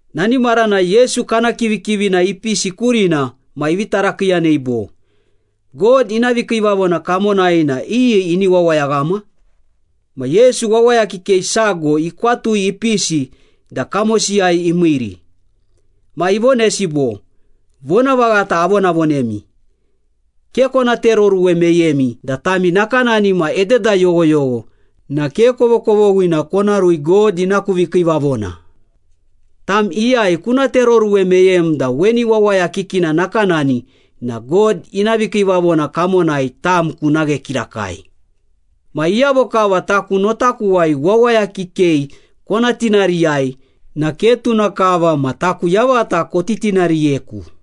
Nani maranai Yesu kana kivikivina ipisi kurina ma ivi tarakiiyanei bo, “God ina vikiivavona kamonai na iyi ini wawayaghama?” Ma Yesu wawaya kikei sago ikwatui ipisi da kamosiyai imiiri. Ma ivonesi bo, “Vonavaghata avonavonemi, ke kona tereoruwe meyemi da tami nakanani ma ededa yoghoyogho na ke kovokovoghina kona rui God ina ku vikiivavona. Tam iyai kuna tereoruwe meyem da weni wawaya kikina nakanani na God ina vikiivavona kamonai tam kuna ghe kirakai.” “Ma iyavo kava taku notakuwai wawaya kikei kona tinariyai na ke tuna kava ma taku yavata kotitinariyeku.”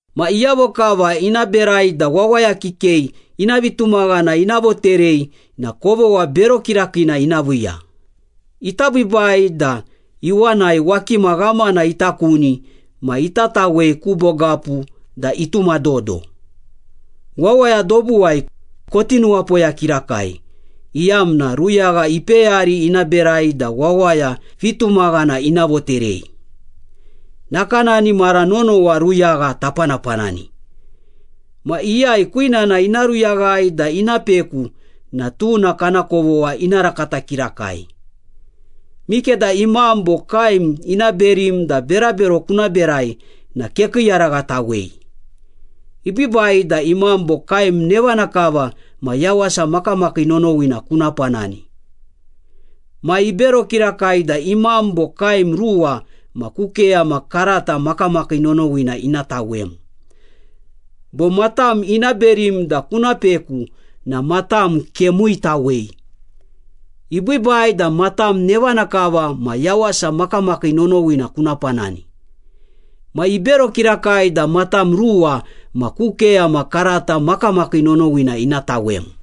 “Ma iyavo kava ina berai da wawaya kikei ina vitumaghana ina voterei na kovogha bero kirakiina ina viiya. Ita biibai da iwanai wakima ghamana ita kuni ma ita tawei ku bogapu da ituma dodo. Wawaya dobuwai, koti nuwapoya kirakai iyamna ruyagha ipeyari ina berai da wawaya vitumaghana ina voterei. Nakanani mara nonowa ruyagha tapanapanani. Ma iyai kwinana ina ruyaghai da ina peku na tuna kana kovogha ina rakata kirakai.” “Mikeda imam bo kaem ina berim da berabero kuna berai na kekiiyaraghatawei. Ibiibai da imam bo kaem nevana kava ma yawasa makamakii nonowina kuna panani. Ma ibero kirakai da imam bo kaem ruwa ma ku keyama karata makamakii nonowina ina tawem. Bo matam ina berim da kuna peku na matam kemuitawei. Ibiibai da matam nevana kava ma yawasa makamakii nonowina kuna panani. Ma ibero kirakai da matam ruwa ma ku keyama karata makamakii nonowina ina tawem.”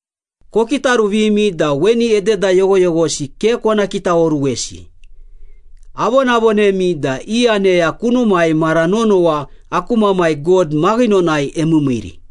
“Kokitaruvimi da weni ededa yoghoyoghosi ke kona kitaoruwesi. Avonavonemi da i aneya kunumai mara nonowa aku Mamai God maghinonai emiimiiri.”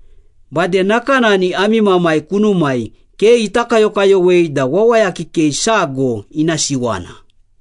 Bade nakanani ami Mamai kunumai ke ita kayokayowei da wawaya kikei sago ina siwana.”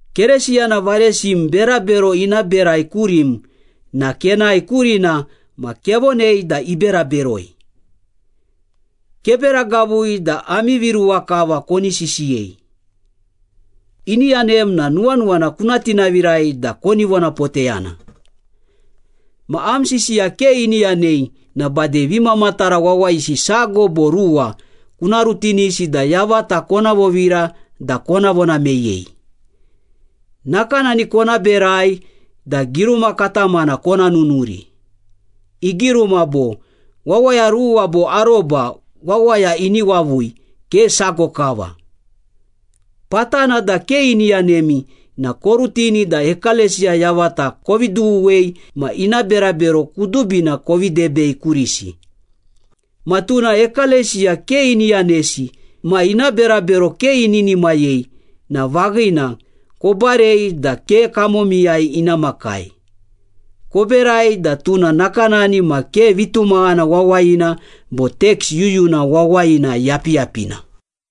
“Keresiyana varesim berabero ina berai kurim na kenae kurina ma kevonei da ibera beroi. Kebera gavui da ami viruwa kava koni sisiyei. Ini yanem na nuwanuwana kuna tinavirai da koni vonapoteyana. Ma am sisiya ke ini yanei na bade vimamatara wawayisi sago bo ruwa kuna rutinisi da yavata kona vovira da kona vona meyei. Nakanani kona berai da giruma katamana kona nunuri. Igiruma bo, ‘Wawaya ruwa bo aroba wawaya ini wavui, ke sago kava.’ Patana da ke ini yanemi na korutini da ekalesiya yavata kovi dughuwei ma ina berabero kudubina kovi debei kurisi. Ma tuna ekalesiya ke ini yanesi ma ina berabero ke ininimayei na vaghina, kobarei da ke kamomiyai ina makai. Koberai da tuna nakanani ma ke vitumaghana wawayina bo teks yuyuna wawayina yapiyapina.”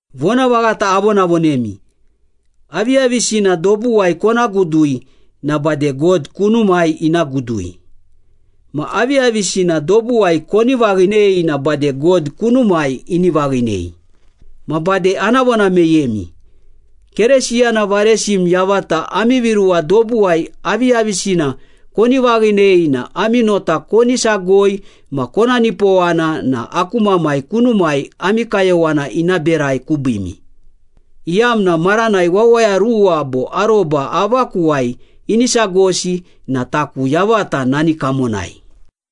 “Vonavaghata avonavonemi, aviyavisina dobuwai kona gudui na bade God kunumai ina gudui. Ma aviyavisina dobuwai koni vaghinei na bade God kunumai ini vaghinei. Ma bade ana vona meyemi. Keresiyana varesim yavata ami viruwa dobuwai aviyavisina koni vaghinei na ami nota koni sagoi ma kona nipowana na aku Mamai kunumai ami kayowana ina berai kubiimi, iyamna maranai wawaya ruwa bo aroba avakuwai ini sagosi na taku yavata nani kamonai.”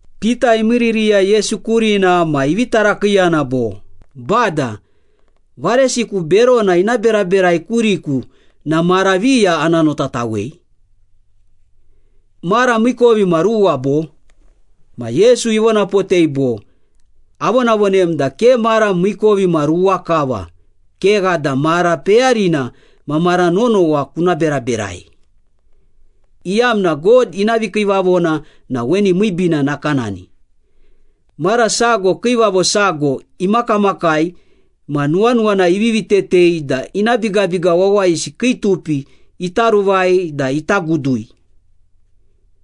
Pita imiiririya Yesu kurina ma ivi tarakiiyana bo, “Bada, varesiku berona ina beraberai kuriku na mara viya ana notatawei? Mara miikovimaruwa bo?” Ma Yesu ivonapotei bo, “Avonavonem da ke mara miikovimaruwa kava, kegha da mara peyarina ma mara nonowa kuna beraberai, iyamna God ina vikiivavona na weni miibiina nakanani. Mara sago kiivavo sago imakamakai ma nuwanuwana ivivi tetei da ina bigabiga wawayisi kii tupi ita ruvai da ita gudui.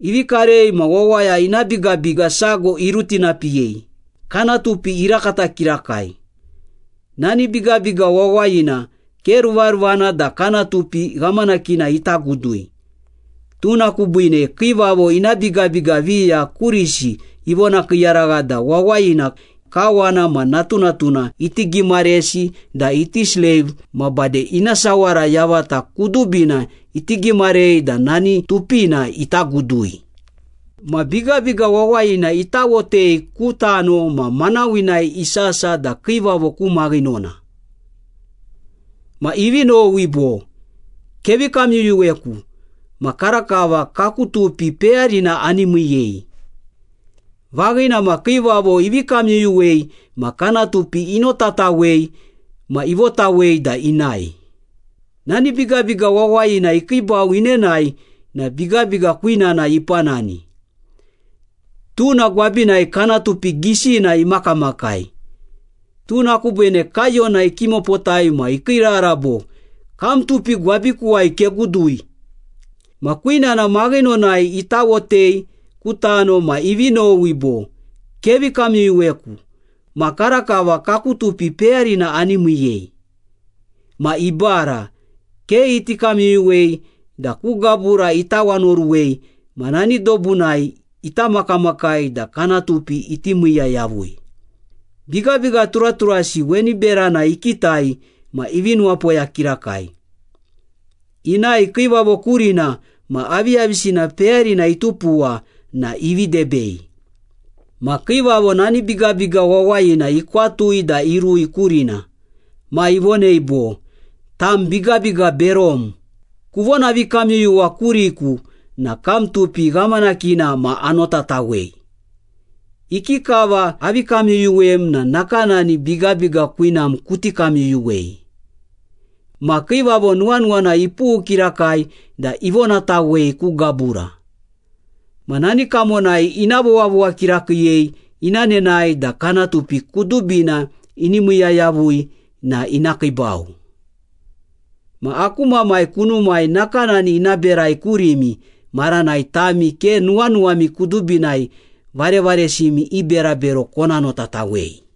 Ivi karei ma wawaya ina bigabiga sago irutinapiyei, kana tupi irakata kirakai. Nani bigabiga wawayina ke ruvaruvana da kana tupi ghamanakina ita gudui. Tuna kubiine kiivavo ina bigabiga viya kurisi ivonakiiyaragha da wawayina, kawana ma natunatuna iti gimaresi da iti sleiv ma bade ina sawara yavata kudubina iti gimarei da nani tupina ita gudui.” “Ma bigabiga wawayina itawotei ku tano ma manawinai isasa da kiivavo ku maghinona. Ma ivi nowi bo, ‘Kevi kamyuyuweku ma karakava kaku tupi peyarina ani miiyei.’ Vaghina ma, kiivavo ivi kamyuyuwei ma kana tupi inotatawei ma ivotawei da inae.” “Nani bigabiga wawayina ikiibau inenae na bigabiga kwinana ipanani. Tuna gwabinai kana tupi gisina imakamakai. Tuna kubiine kaiyona ikimopotai ma ikiirara bo, ‘Kam tupi gwabikuwai kegudui!’” “Ma kwinana maghinonai itawotei ku tano ma ivi nowi bo, ‘Kevi kamyuyuweku ma karakava kaku tupi peyarina ani miiyei.’” “Ma ibara, ke iti kamyuyuwei da ku gabura itawanaoruwei ma nani dobunai ita makamakai da kana tupi iti miiya yavui. Bigabiga turaturasi weni berana ikitai ma ivi nuwapoya kirakai. Inae kiivavo kurina ma aviyavisina peyarina itupuwa na ivi debei.” “Ma kiivavo nani bigabiga wawayina ikwatui da irui kurina. Ma ivonei bo, ‘Tam bigabiga berom! Kuvonavikamyuyuwa kuriku na kam tupi ghamanakina ma anotatawei. Ikikava avi kamyuyuwem na nakanani bigabiga kwinam kuti kamyuyuwei.’ Ma kiivavo nuwanuwana ipughu kirakai da ivonatawei ku gabura. Ma nani kamonai ina vowavowa kirakiiyei ina nene da kana tupi kudubina ini miiya yavui na ina kiibau.” “Ma aku Mamai kunumai nakanani ina berai kurimi maranai tami ke nuwanuwami kudubinai varevaresimi i berabero kona notatawei.”